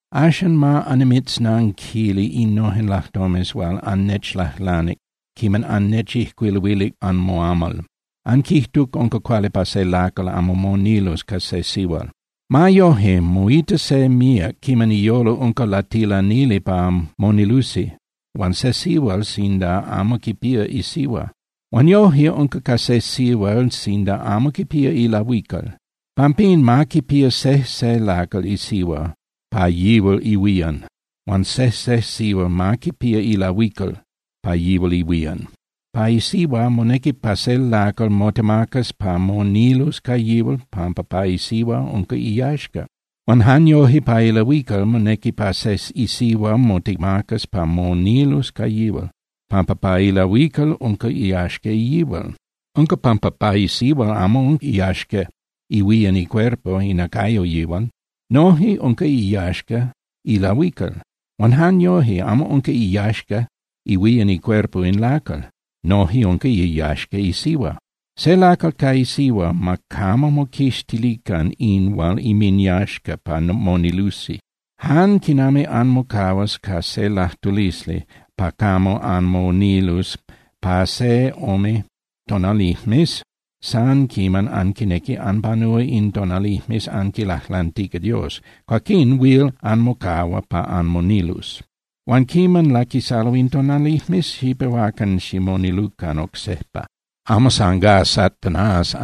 Axan ma annimitznanquili innojen lajtomes hual annechlajlanic quiman annechijcuiluilic pa anmoamal. Anquijtuc unca cuali pa se lacal amo monilus ca se sihual. Ma yoje, moita se míac quiman iyolo unca latilanili pa monilusi huan se sihual sinda amo quipía isihua. Huan yoje unca ca se sihual sinda amo quipía ilahuical. Pampín, ma quipía sejse lacal isihua pa yihual ihuían. Huan sejse sihual ma quipía ilahuical pa yihual ihuían. Pa isihua, monequi pa se lacal motemacas pa monilus ca yihual, pampa pa isihua unca iyaxca. Huan jan yoje pa ilahuical, monequi pa se isihua motemacas pa monilus ca yihual, pampa pa ilahuical unca iyaxca yihual. Unca pampa pa isihua amo unca iyaxca ihuían icuerpo (inacayo) yihual. Noje unca iyaxca ilahuical. Huan jan yoje, amo unca iyaxca ihuían icuerpo in lacal, noje unca iyaxca isihua. Se lacal ca isihua, ma camo moquixtilican in hual inminyaxca pa monilusi. Jan quiman anmocahuas ca se lajtulisli pa camo anmonilus pa se ome tonalijmes san quiman anquinequi anpanúa in tonalijmes anquilajlantica Dios, cuaquín huil anmocahua pa anmonilus. Huan quiman laquisalo in tonalijmes, xipehuacan ximonilucan oc sejpa, amo san gá Satanás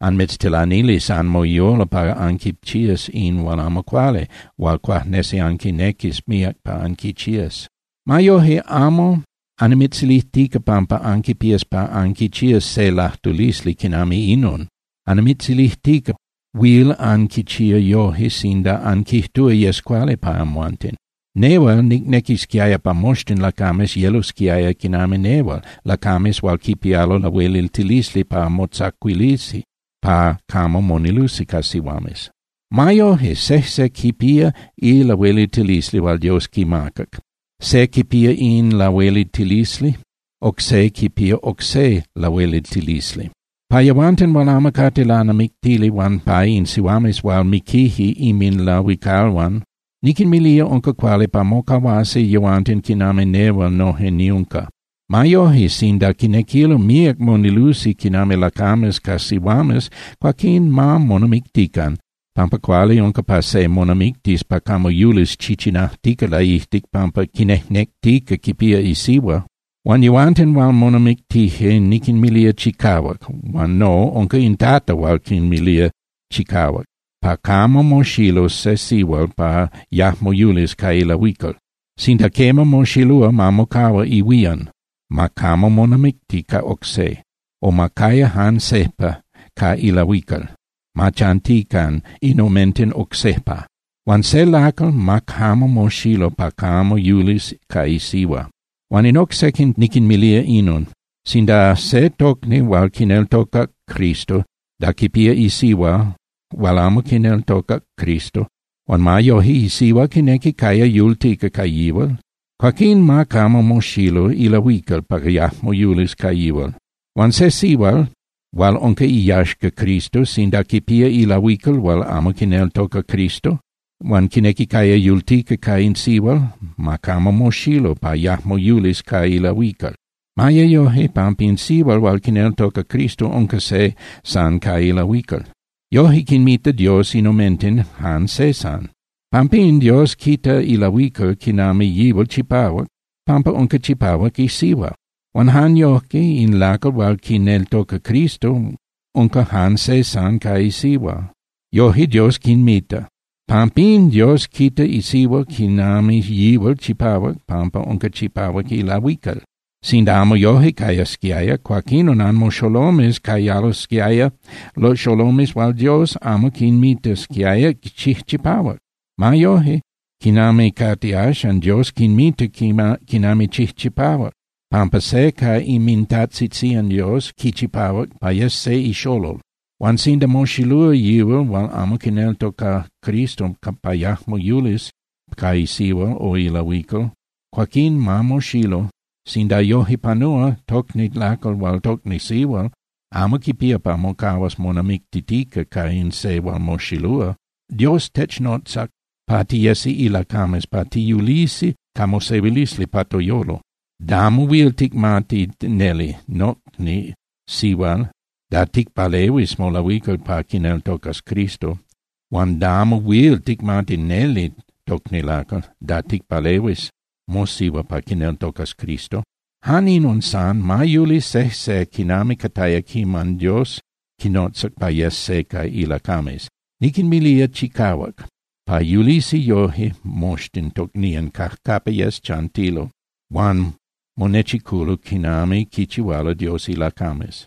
anmitztilanilis anmoyolo pa anquichías in hual amo cuali hual cuajnesi anquinequis míac pa anquichías. Ma yoje, amo annimitzilijtica pampa anquipías pa anquichías se lajtulisli quinami inon. Annimitzilijtica huil anquichía yoje sinda anquijtúa yes cuali pa amhuanten. Nehual nicnequisquiaya pa moxtin lacames yelosquiaya quinami nehual, lacames hual quipialo lahueliltilisli pa motzacuilisi pa camo monilusi ca sihuames. Ma yoje, sejse quipía ilahueliltilisli hual Dios quimacac, se quipía in lahueliltilisli, oc se quipía oc se lahueliltilisli. Pa yehuanten hual amo cate lanamictili huan pa in sihuames hual miquije inminlahuicalhuan, niquinmilía unca cuali pa mocahuasi yehuanten quinami nehual noje niunca. Ma yoje, sinda quinequilo míac monilusi quinami lacames ca sihuames, cuaquín ma monamictican, pampa cuali unca pa se monamictis pa camo yulis chichinajtica laijtic pampa quinejnectica quipía isihua. Huan yehuanten hual monamictije, niquinmilía chicahuac, huan no, unca in Tata hual quinmilía chicahuac, pa camo moxilus se sihual pa yajmo yulis ca ilahuical. Sinda quema, moxilúa, ma mocahua ihuían, ma camo monamicti ca oc se, o ma caya jan sejpa ca ilahuical, ma chantican in omenten oc sejpa. Huan se lacal, ma camo moxilu pa camo yulis ca isihua. Huan in oc sequin niquinmilía inon: Sinda se tocni hual quineltocac Cristo, da quipía isihua hual amo quineltocac Cristo huan ma yoje isihua quinequi caya yultica ca yihual, cuaquín ma camo moxilu ilahuical pa yajmo yulis ca yihual. Huan se sihual hual unca iyaxca Cristo, sinda quipía ilahuical hual amo quineltoca Cristo, huan quinequi caya yultica ca in sihual, ma camo moxilu pa yajmo yulis ca ilahuical. Ma ye yoje, pampa in sihual hual quineltoca Cristo unca se san ca ilahuical. Yoje quinmita Dios in omenten jan se san. Pampín Dios quita ilahuical quinami yihual chipahuac, pampa unca chipahuac isihua. Huan jan yojque, in lacal hual quineltoca Cristo unca jan se san ca isihua. Yoje Dios quinmita. Pampín Dios quita isihua quinami yihual chipahuac pampa unca chipahuac ilahuical. Sinda amo yoje cayasquiaya, cuaquinon anmoxolomes cayalosquiaya xolomes hual Dios amo quinmitasquiaya chijchipahuac. Ma yoje, quinami cate axan, Dios quinmita quinami chijchipahuac, pampa se ca inmintajtzitzían Dios quichipahuac pa yes se ixolol. Huan sinda moxilúa yihual hual amo quineltoca Cristo, pa yajmo yulis ca isihua o ilahuical cuaquín ma moxilu. Sinda yoje panúa, tocni lacal huan tocni sihual amo quipía pa mocahuas monamictitica ca in se hual moxilúa. Dios technotzac pa tiyesi ilacames pa tiyulisi ca mosehuilisli pa toyolo. Damo huil ticmati neli, nocni sihual, da ticpalehuis molahuical pa quineltocas Cristo. Huan damo huil ticmati neli, tocni lacal, da ticpalehuis mosihua pa quineltocas Cristo. Jan inon san, ma yuli sejse quinami cataya quiman Dios quinotzac pa yes se ca ilacames. Niquinmilía chicahuac pa yulisi yoje moxtin tocnían cajcapa yes chantilo huan monechiculo quinami quichihualo Dios ilacames.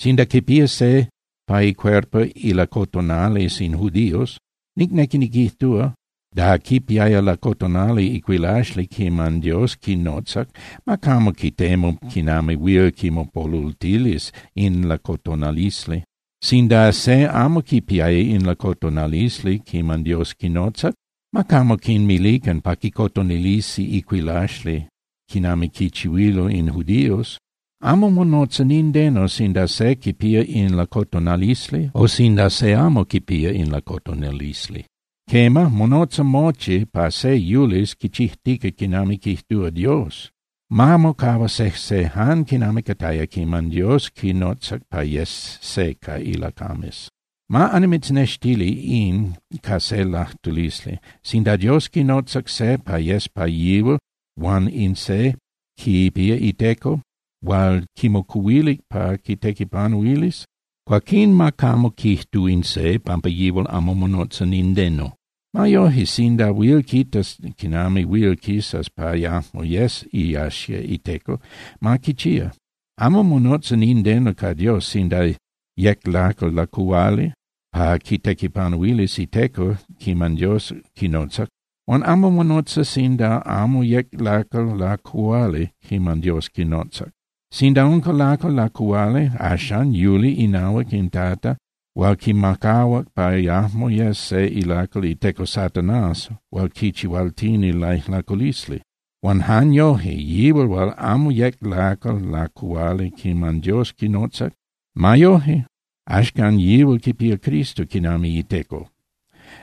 Sinda quipía se pa icuerpo ilacotonalisli in judíos, nicnequi niquijtúa, da quipiaya lacotonali icuilaxli quiman Dios quinotzac, ma camo quitemu quinami huil quimopolultilis in lacotonalisli. Sinda se amo quipiaya in lacotonalisli quiman Dios quinotzac, ma camo quinmilican pa quicotonilisi icuilaxli quinami quichihuililo in judíos. Amo monotza nindeno sinda se quipía in lacotonalisli o sinda se amo quipía in lacotonalisli. Quema, monotza mochi pa se yulis quichijtica quinami quijtúa Dios. Ma mocahua sejse jan quinami cataya quiman Dios quinotzac pa yes se ca ilacames. Ma annimitznextili in ca se lajtulisli. Sinda Dios quinotza se pa yes pa yihual huan in se quipía iteco hual quimocuhuilic pa quitequipanuilis, cuaquín ma camo quijtu in se pampa yihual amo monotza nindeno. Ma yoje, sinda huil quitas quinami huil quisas pa yajmo yes iyaxca iteco, ma quichía. Amo monotza nindeno ca Dios sinda yec lacal lacuhuali pa quitequipanuilis iteco quiman Dios quinotzac. Huan amo monotza sinda amo yec lacal lacuhuali quiman Dios quinotzac. Sinda unca lacal lacuhuali, axan yuli inahuac in Tata hual quimacahuac pa yajmo yes se ilacal iteco Satanás hual quichihualtini laijlaculisli. Huan jan yoje, yihual hual amo yec lacal lacuhuali quiman Dios quinotzac, ma yoje, axcan yihual quipía Cristo quinami iteco.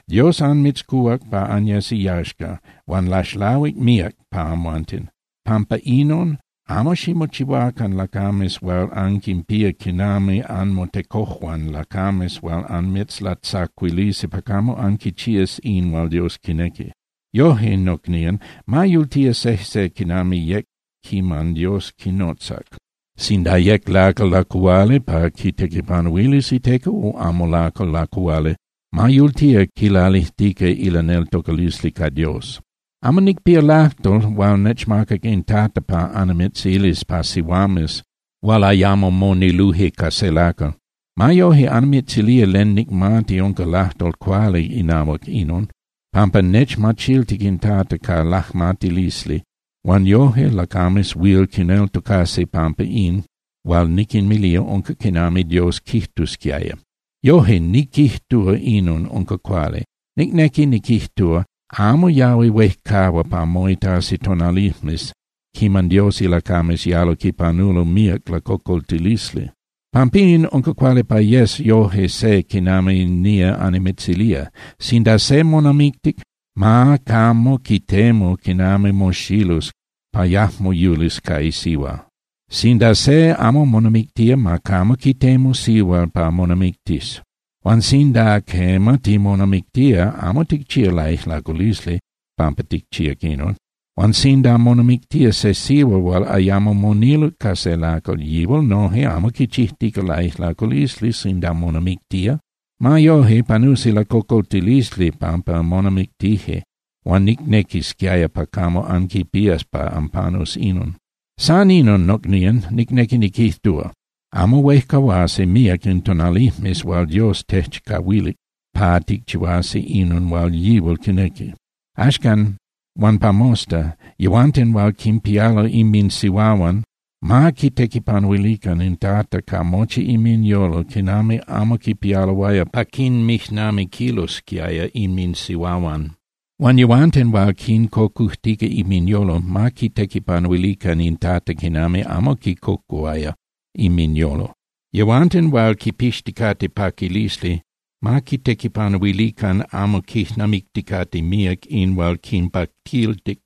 Dios anmitzcuhuac pa anyes iyaxca, huan laxlahuic míac pa amhuanten. Pampa inon, amo ximochihuacan lacames hual anquinpía quinami anmotecojuan lacames hual anmitzlatzacuilisi pa camo anquichías in hual Dios quinequi. Yoje, nocnían, ma yultía sejse quinami yec quiman Dios quinotzac, sinda yec lacal lacuhuali pa quitequipanuilis iteco o amo lacal lacuhuali, ma yultía quilalijtica ilaneltocalisli ca Dios. Amo nicpía lajtol hual nechmacac in Tata pa annimitzilis pa sihuames hual ayamo moniluje ca se lacal. Ma yoje annimitzilía len nicmati unca lajtol cuali inahuac inon, pampa nechmachiltic in Tata ca lajmatilisli huan yoje lacames huil quineltocasi pampa in hual niquinmilía unca quinami Dios quijtusquiaya. Yoje, niquijtúa inon unca cuali. Nicnequi niquijtúa, amo yahui huejcahua pa moitasi tonalijmes quiman Dios ilacames yalo quipanulo míac lacocoltilisli. Pampín unca cuali pa yes yoje se quinami nía annimitzilía: Sinda se monamictic, ma camo quitemu quinami moxilus pa yajmo yulis ca isihua. Sinda se amo monamictía, ma camo quitemu sihual pa monamictis. Huan sinda, quema, timonamictía, amo ticchía laijlaculisli pampa ticchíac inon. Huan sinda monamictía se sihual hual ayamo moniluc ca se lacal, yihual noje amo quichijtica laijlaculisli sinda monamictía. Ma yoje, panusi lacocoltilisli pampa monamictije, huan nicnequisquiaya pa camo anquipías pa anpanus inon. San inon, nocnían, nicnequi niquijtúa. Amo huejcahuasi míac in tonalijmes hual Dios techcahuilic pa ticchihuasi inon hual yihual quinequi. Axcan huan pa mosta, yehuanten hual quinpialo inminsihuahuan, ma quitequipanuilican in Tata ca mochi inminyolo quinami amo quipialoaya pa quinmijnamiquilosquiaya inminsihuahuan. Huan yehuanten hual quincocujtica inminyolo, ma quitequipanuilican in Tata quinami amo quicocuhuaya inminyolo. Yehuanten hual quipixticate paquilisli, ma quitequipanuilican amo quijnamicticate míac in hual quinpaquiltic.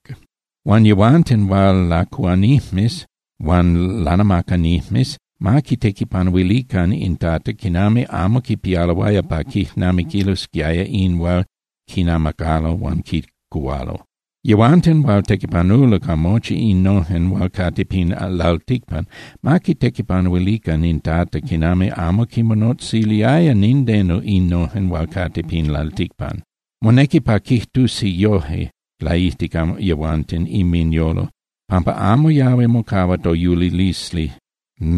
Huan yehuanten hual lacuhuanijmes huan lanamacanijmes ma quitequipanuilican in Tata quinami amo quipialoaya pa quijnamiquilosquiaya in hual quinamacalo huan quicuhualo. Yehuanten hual tequipanulo ca mochi innojen hual cate pin lalticpan, ma quitequipanuilican in Tata quinami amo quinmonotziliaya nindeno innojen hual cate pin lalticpan. Monequi pa quijtusi yojque laijtic yehuanten inminyolo, pampa amo yahui mocahua toyulilisli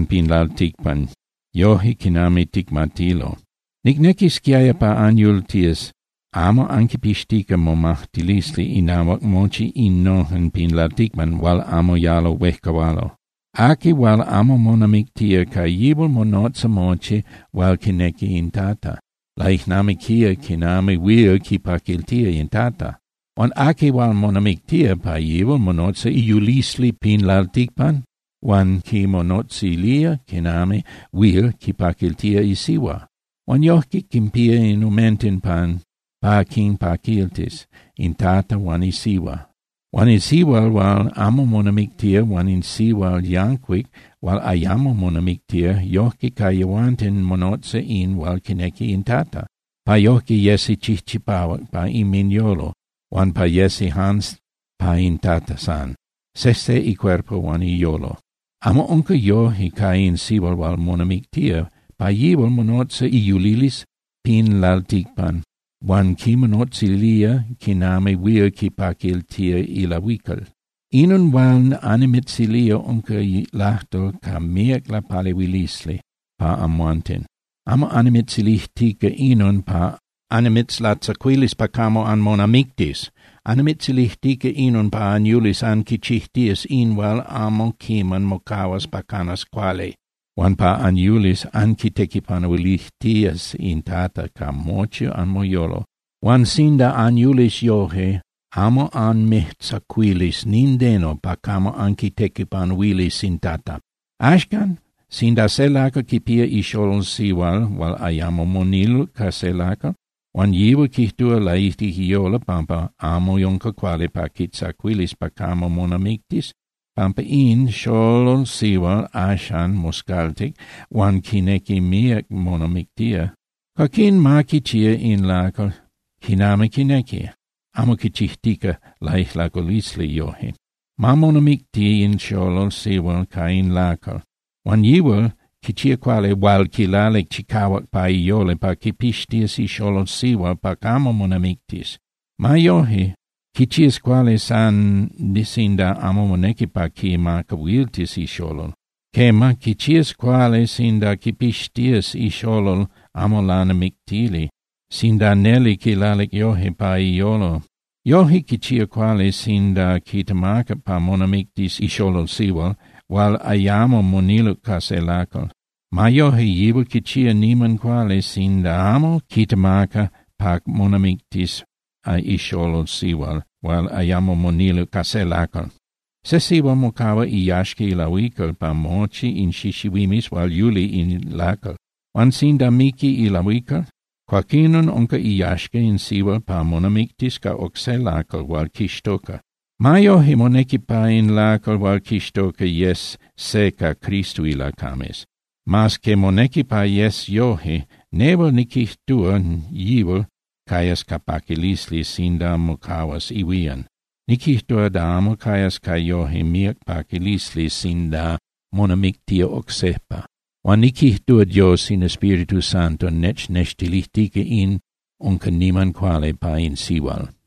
pin lalticpan yojque quinami ticmatilo. Nicnequisquiaya pa anyultías amo anquipixtica momajtilisli inahuac mochi innojen pin lalticpan hual amo yalo huejcahualo. Aqui hual amo monamictía, ca yihual monotza mochi hual quinequi in Tata, laijnamiquía quinami huil quipaquiltía in Tata. Huan aqui hual monamictía, pa yihual monotza iyulilisli pin lalticpan, huan quimonotzilía quinami huil quipaquiltía isihua. Huan yojque quinpía in omenten pa quinpaquiltis, in Tata huan isihua. Huan in sihual hual amo monamictía huan in sihual yancuic hual ayamo monamictía, yoje ca yehuanten monotza in hual quinequi in Tata, pa yojque yesi chijchipahuac pa inminyolo huan pa yesi jan pa in Tata san, sejse icuerpo huan iyolo. Amo unca yoje ca in sihual hual monamictía. Pa yihual monotza iyulilisli pin lalticpan huan quimonotzilía quinami huil quipaquiltía ilahuical. Inon hual annimitzilía unca lajtol ca míac lapalehuilisli pa amhuanten. Amo annimitzilijtica inon pa annimitzlatzacuilis pa camo anmonamictis. Annimitzilijtica inon pa anyulis anquichijtías in hual amo quiman mocahua pa canas cuali, huan pa anyulis anquitequipanuilijtías in Tata ca mochi anmoyolo. Huan sinda anyulis yoje, amo anmijtzacuilis nindeno pa camo anquitequipanuilis in Tata. Axcan, sinda se lacal quipía ixolol sihual hual ayamo moniluc ca se lacal, huan yihual quijtúa laijtic iyolo pampa amo unca cuali pa quitzacuilis pa camo monamictis pampa in xolol sihual axan moscaltic huan quinequi míac monamictía, cuaquín ma quichía in lacal quinami quinequi, amo quichijtica laijlaculisli yoje. Ma monamicti in xolol sihual ca in lacal. Huan yihual quichía cuali hual quilalic chicahuac pa iyolo pa quipixtías ixolol sihual pa camo monamictis. Ma yoje, quichías cuali san sinda amo monequi pa quimacahuiltis ixolol, quema, quichías cuali sinda quipixtías ixolol amo lanamictili, sinda neli quilalic yojque pa iyolo. Yoje, quichía cuali sinda quitemaca pa monamictis ixolol sihual hual ayamo moniluc ca se lacal. Ma yoje, yihual quichía niman cuali sinda amo quitemaca pa monamictis ixolol sihual hual ayamo moniluc ca se lacal. Se sihual mocahua iyaxca ilahuical pa mochi in xixihuimes hual yuli in lacal. Huan sinda miqui ilahuical, cuaquinon unca iyaxca in sihual pa monamictis ca oc se lacal hual quixtoca. Ma yoje monequi pa in lacal hual quixtoca yes se ca Cristo ilacames. Mas que monequi pa yes yoje, nehual niquijtúa yihual cayas ca paquilisli sinda mocahua ihuían. Niquijtúa da amo cayas ca yoje míac paquilisli sinda monamictía oc sejpa. Huan niquijtúa Dios in Espíritu Santo nechnextilijtica in unca niman cuali pa in sihual.